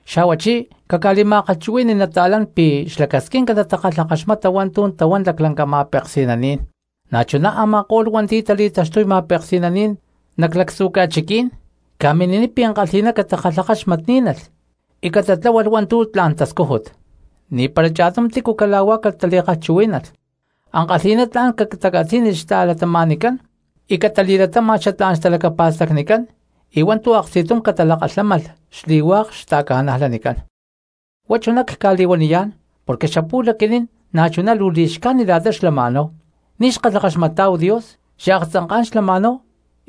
Xa̠huachí caca̠li̠ma̠kalhchuhui̠ni cristianos pi̠ xlacasquinca natakalhakaxmata hua̠ntu̠ tahuán laclanca ma̠peksi̠naní̠n, na̠chuná a̠ma̠ko̠lh hua̠nti̠ tali̠taxtuy ma̠peksi̠naní̠n nac lactzu̠ ca̠chiquí̠n, ca̠mini̠niy pi̠ ankalhi̠ná catakalhakaxmatní̠nalh y catatláhualh hua̠ntu̠ tla̠n tascújut. Ni̠pára cha̠tum tícu cala̠huá catali̠kalhchuhuí̠nalh, ankalhi̠ná tla̠n catacatzí̠nilh xta̠cristianoscán y catali̠latáma̠lh xatlá̠n xtalacapa̠stacnicán y hua̠ntu̠ aksti̠tum catalakalhámalh xli̠hua̠k cristianos. Huá chuná cca̠li̠huaniyá̠n porque xapu̠lh aquinín na̠chuná luu li̠xcájnit la̠ta xlama̠náhu, ni̠ xkalhakaxmatá̠hu Dios, xaaktzanká̠n xlama̠náhu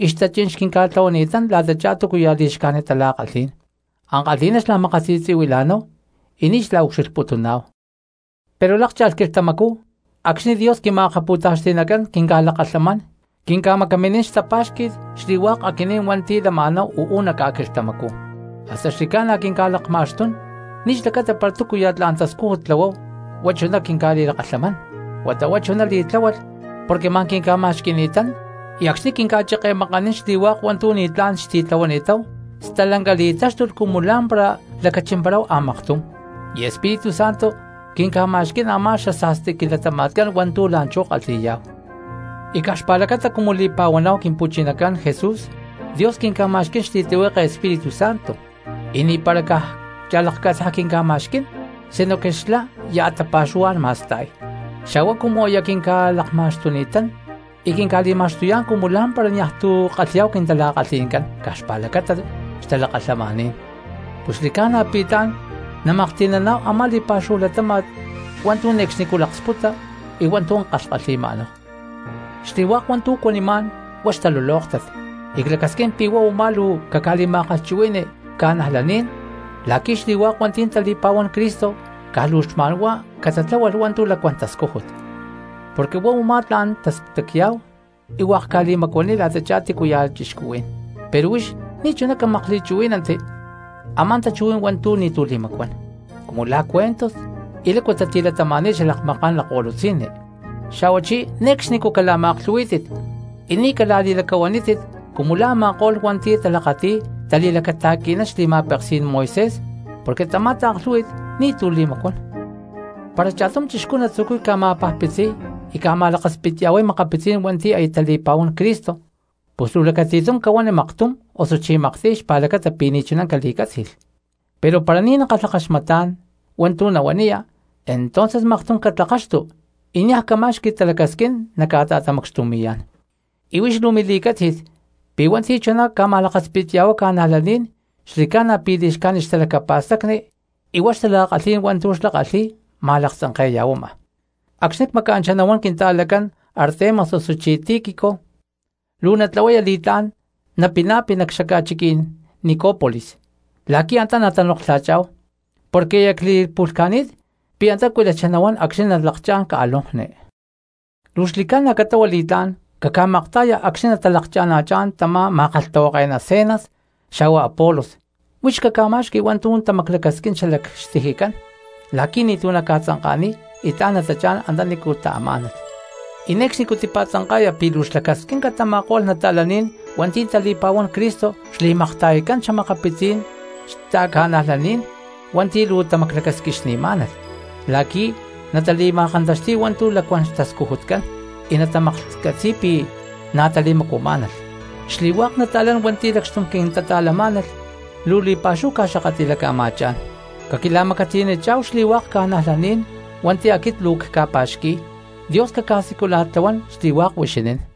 y xtachí̠n xquinca̠tlahuani̠tán la̠tachá túcuya̠ li̠xcájnit tala̠kalhí̠n, ankalhi̠ná xla̠makasi̠tzi̠huila̠náhu y ni̠ xla̠ucxilhputuná̠hu. Pero lákcha̠lh quilhtamacú acxni̠ Dios quima̠akapu̠taxti̠nacán quinca̠lakalhamán quinca̠macaminín xtapa̠xqui̠t xli̠hua̠k aquinín hua̠nti̠ lama̠náhu uú nac ca̠quilhtamacú, hasta xli̠ca̠na quinca̠lakma̠xtún, ni̠ xlacata para túcuya̠ tla̠n tascújut tlahuáhu huá chuná quinca̠li̠lakalhamán, huata huá chuná li̠tláhualh porque ma̠n quinca̠pa̠xqui̠ni̠tán. Y acxni̠ quinca̠cheke̠makanín xli̠hua̠k hua̠ntu̠ ni̠tlá̠n xtitlahuani̠táhu stalanca li̠táxtulh cumu lá̠mpara lacachimparáhu a̠maktum, y Espíritu Santo quinca̠ma̠xquí̠n a̠má xasa̠sti quilatama̠tcán hua̠ntu̠ la̠nchú kalhi̠yá̠hu. Y caj xpa̠lacata cumu li̠pa̠huaná̠hu Quimpu̠chinacán Jesús, Dios quinca̠ma̠xquí̠n xli̠tlihueke Espíritu Santo, y ni̠para caj cha̠lakcatzaj quinca̠ma̠xquí̠n sinoque xlá ya̠ tapa̠xuhuá̠n ma̠sta̠y. Xa̠huá cumu aya quinca̠lakma̠xtuni̠tán y quinca̠li̠ma̠xtuyá̠n cumu lá̠mpara niaj tu̠ kalhi̠yá̠hu quintala̠kalhi̠ncán caj xpa̠lacata xtalakalhamaní̠n, pus xli̠ca̠na pi̠ tla̠n namaklhti̠naná̠hu a̠má li̠pa̠xúhu latáma̠t hua̠ntu̠ ne̠cxnicú laksputa y hua̠ntu̠ kalhkalhi̠ma̠náhu. Xli̠hua̠k hua̠ntu̠ cuanimá̠n huá xtalulóktat y clacasquín pi̠ huá u̠má luu caca̠li̠ma̠kalhchuhui̠ni cristianos la̠qui̠ xli̠hua̠k hua̠nti̠ tali̠pa̠huán Cristo caj luu xma̠n huá catatláhualh hua̠ntu̠ lacuán tascújut, porque huá u̠má tla̠n tastacya̠hu y hua̠k ca̠li̠macuaniy la̠tachá tícu ya̠ cristianos. Pero huix ni̠chuná camakli̠chuhuí̠nanti a̠má tachuhuí̠n hua̠ntu̠ ni̠tu̠ li̠macuán, cumu la̠ cuentos y lácu tatilatama̠ni̠t xalakmaká̠n lakko̠lutzi̠nni, xa̠huachí ne̠cxnicú cala̠ma̠aklhu̠huí̠tit y ni̠ cala̠li̠lacahuanítit cumu la̠ a̠ma̠ko̠lh hua̠nti̠ talakati̠y tali̠lacata̠qui̠nán xli̠ma̠pekí̠n Moisés porque tamá taaklhú̠hui̠t ni̠tu̠ li̠macuán. Para cha̠tum cristiano natzucuy ca̠ma̠pajpitziy y ca̠ma̠lakaspitya̠huay makapitzí̠n hua̠nti̠ aya tali̠pa̠huán Cristo, pus luu lacati̠tum cahuani maktum osuchí maktiy xlacata pi̠ ni̠chuná cali̠cátzi̠lh. Pero para ni̠ nakalhakaxmatá̠n hua̠ntu̠ nahuaniya, entonces maktum catlakaxtu y niaj cama̠xqui talacasquín naca̠ta̠tamacxtumi̠yá̠n. Y huix luu mili̠cátzi̠t pi̠ hua̠nti̠ chuná ca̠ma̠lakaspitya̠huay cristianos xli̠ca̠na pi̠ li̠xcájnit xtalacapa̠stacni y huá xtala̠kalhí̠n hua̠ntu̠ xlá kalhi̠y ma̠laktzanke̠ya̠huama. Acxni̠ cmaca̠nchá nahuán quinta̠lacán Artemas osuchí Tíquico, luu natlahuaya li̠tlá̠n napina̠pi nac xaca̠chiquí̠n Ni̠có̠polis la̠qui̠ antá natanoklha̠chá̠hu, porque aya cli̠pu̠lhca̠ni̠t pi̠ antá cuilachá nahuán acxni̠ nalakchá̠n ca̠lonkni. Luu xli̠ca̠na catlahua li̠tlá̠n caca̠makta̠ya acxni̠ natalakcha̠na̠chá̠n tamá ma̠kalhtahuake̠ná Zenas xa̠hua Apolos, huix caca̠ma̠xqui hua̠ntu̠ tamaclacasquín xalac xtijicán la̠qui̠ ni̠tu̠ naca̠tzanka̠niy y tla̠n natachá̠n antanícu taamá̠nalh. Y ne̠cxnicú tipa̠tzanka̠ya pi̠ luu xlacasquinca tama̠ko̠lh cristianos hua̠nti̠ tali̠pa̠huán Cristo xli̠makta̠yatcán xa̠makapitzí̠n xta̠cristianoscán hua̠nti̠ luu tamaclacasquixni̠má̠nalh la̠qui̠ natali̠ma̠kantaxti̠y hua̠ntu̠ lacuán xtascujutcán y natamaklhcatzi̠y pi̠ na̠ tali̠macuamá̠nalh. Xli̠hua̠k nata̠lán hua̠nti̠ lacxtum quintata̠lamá̠nalh luu li̠pa̠xúhu ca̠xakatli̠laca̠ma̠chá̠n. Caquila̠macatiyanichá̠hu xli̠hua̠k ca̠najlaní̠n hua̠nti̠ aquit luu cca̠pa̠xqui̠y. Dios caca̠siculana̠tlahuán xli̠hua̠k huixinín.